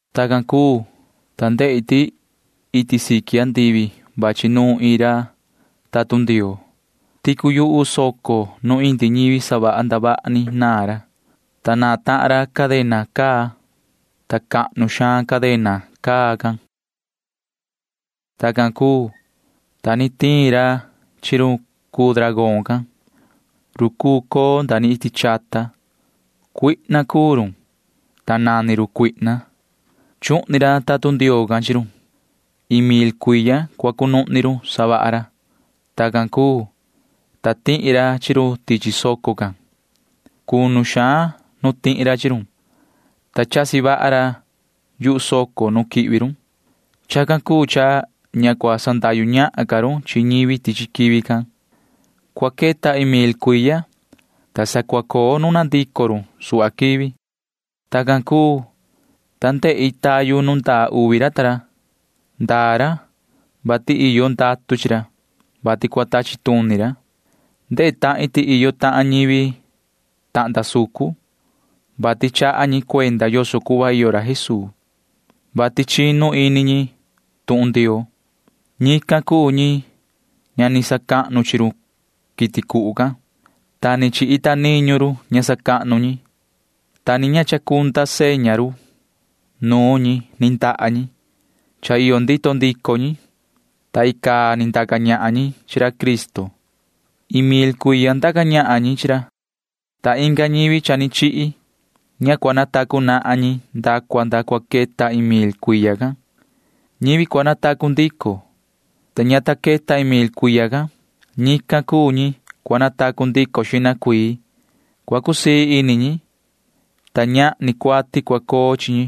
Tacan cuu, ta ndehi ti iti siqui andivi vachi nuun iin ra tatun Ndioo. Ticu yuhu soco nu indi ñivi savaha ndavaha ni naan ra, ta naan tahan ra cadena caa, ta cahnu suhva cadena caa can. Tacan cuu, ta ni tiin ra chi run cuu dragón can―run cuu coo nda ni iti chata. Cuihna cuu run, ta nani run Satanaa. Chuhni ra tatun Ndioo can chi run. Iin mil cuiya cua cunuhni run savaha ra. Tacan cuu, ta tihi ra chi run tichi soco can. Cunu suhva nu tihi ra chi run, ta chasi vaha ra yuhu soco nu quihvi run. Chacan cuu cha ña cua sandahyu ñahan ca run chi ñivi tichi quivi can. Cua queta iin mil cuiya, ta sa cua coo nuna ndico run suhva quivi. Tacan cuu, ta ndehi tayu nu ndaa uvi ra ta ra. Ndaa ra, vati iyo ndatu chi ra, vati cua tachi tuni ra. Ndehe tahin ti iyo tahan ñivi tahnda sucun, vati chaha ñi cuenda yoso cuhva iyo ra Jesuu, vati chinu ini ñi tuhun Ndioo. Ñican cuu ñi ña ni sacahnu chi run quiti cuhu can, ta ni chi ita niñu run ña sacahnu ñi, ta ni ña ni chacunda seña run nuun ñi ni ndaha ñi. Cha iyo ndito ndico ñi, ta icaa ni ndaca ñahan ñi chi ra Cristo. Iin mil cuiya ndaca ñahan ñi chi ra. Ta inga ñivi cha ni chihi―ña cua natacu nahan ñi nda cua nda cua queta iin mil cuiya can. Ñivi cua natacu ndico, ta ña ta queta iin mil cuiya can―ñican cuu ñi cua natacu ndico xihna cuii. Cua cusii ini ñi, ta ñahni cuati cua coo chi ñi.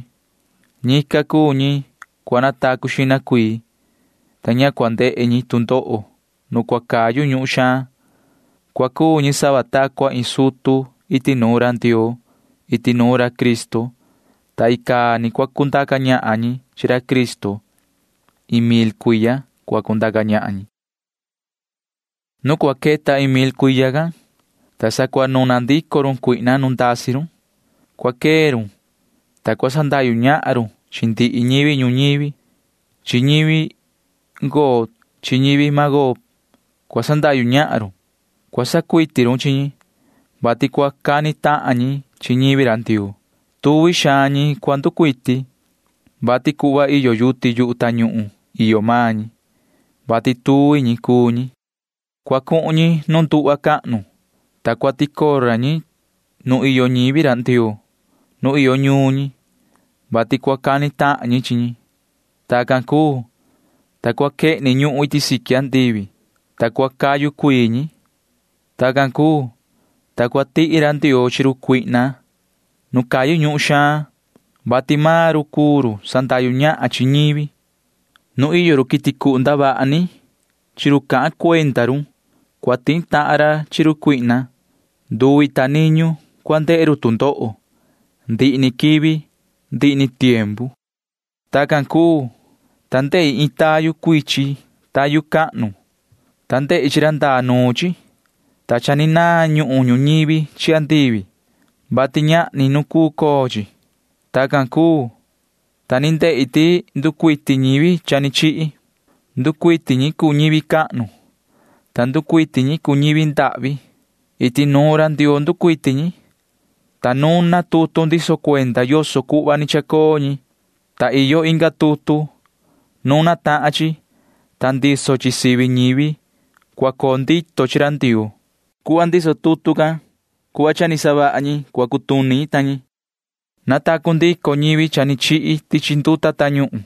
Ñican cuu ñi cua natacu xihna cuii, ta ña cua ndehe ñi tu ndoho nu cua cayu ñuhun xaan. Cua cuu ñi sava ta cua iin sutu iti nuun ra Ndioo iti nuun ra Cristo, ta icaa ni cua cundaca ñahan ñi chi ra Cristo. Iin mil cuiya cua cundaca ñahan ñi. Nu cua queta iin mil cuiya can, ta sa cua nuna ndico run Satanaa nu ndasi run. Cua quee run, ta cua sandahyu ñahan run chi ndihi ñivi ñuñivi. Chi ñivi Gog chi ñivi Magog cua sandahyu ñahan run. Cua sacuiti run chi ñi, vati cua cani tahan ñi chi ñivi ra Ndioo. Tuvi xaan ñi cua nducuiti, vati cuhva iyo yuti yuhu tañuhun iyo maan ñi, [vati tuvi ñi cuu ñi]. Cua cuhun ñi nu nduhva cahnu, ta cua ticora ñi nu iyo ñivi Ndioo nu iyo ñuun ñi, vati cua cani tahan ñi chi ñi. Tacan cuu, ta cua quehni ñuhun iti siqui andivi, ta cua cayu cuii ñi. Tacan cuu, ta cua tihi ra Ndioo chi run cuihna nu cayu ñuhun xaan, vati maan run cuu run sandahyu ñahan chi ñivi. Nu iyo ri quiti cuhu ndavaha ni chi ra cahan cuenda run cua tihi tahan ra chi run cuihna. Nduvi ta niñu cua ndehe run tu ndoho ndihi ni quivi ndihi ni tiempu. Tacan cuu, ta ndehi iin tayu cuichin tayu cahnu, ta ndehi chi ra ndaa nuun chi, ta cha ni naan ñuhun ñuñivi chi andivi, vati ñahni nu cuu coo chi. Tacan cuu, ta ni ndehi ti nducuiti ñivi cha ni chihi. Nducuiti ñi cuu ñivi cahnu, ta nducuiti ñi cuu ñivi ndahvi. Iti nuun ra Ndioo nducuiti ñi, ta nuna tutu ndiso cuenda yoso cuhva ni chacoo ñi, ta iyo inga tutu. Nuna tahan chi, ta ndiso chi sivi ñivi cua coo ndito chi ra Ndioo. Cuhva ndiso tutu can, cuhva cha ni savaha ñi ni cutuni ñi ta ñi. Natacu ndico ñivi cha ni chihi tichi nduta tañuhun,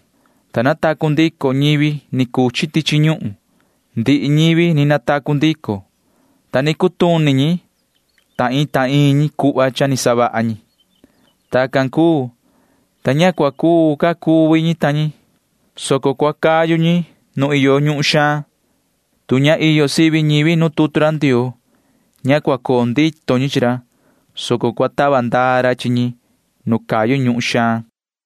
ta natacu ndico ñivi ni cuchi tichi ñuhun. Ndihi ñivi ni natacu ndico, ta ni cutuni ñi ta iin ta iin ñi cuhva cha ni savaha ñi. Tacan cuu, ta ña cua cuu cuvi ca ñivi, soco cua cayu ñi nu iyo ñuhun xaan. Tu ña iyo sivi ñivi nu tutu ra Ndioo, ña cua coo ndito ñi chi ra, soco cua tava ndaa ra chi ñi nu cayu ñuhun xaan.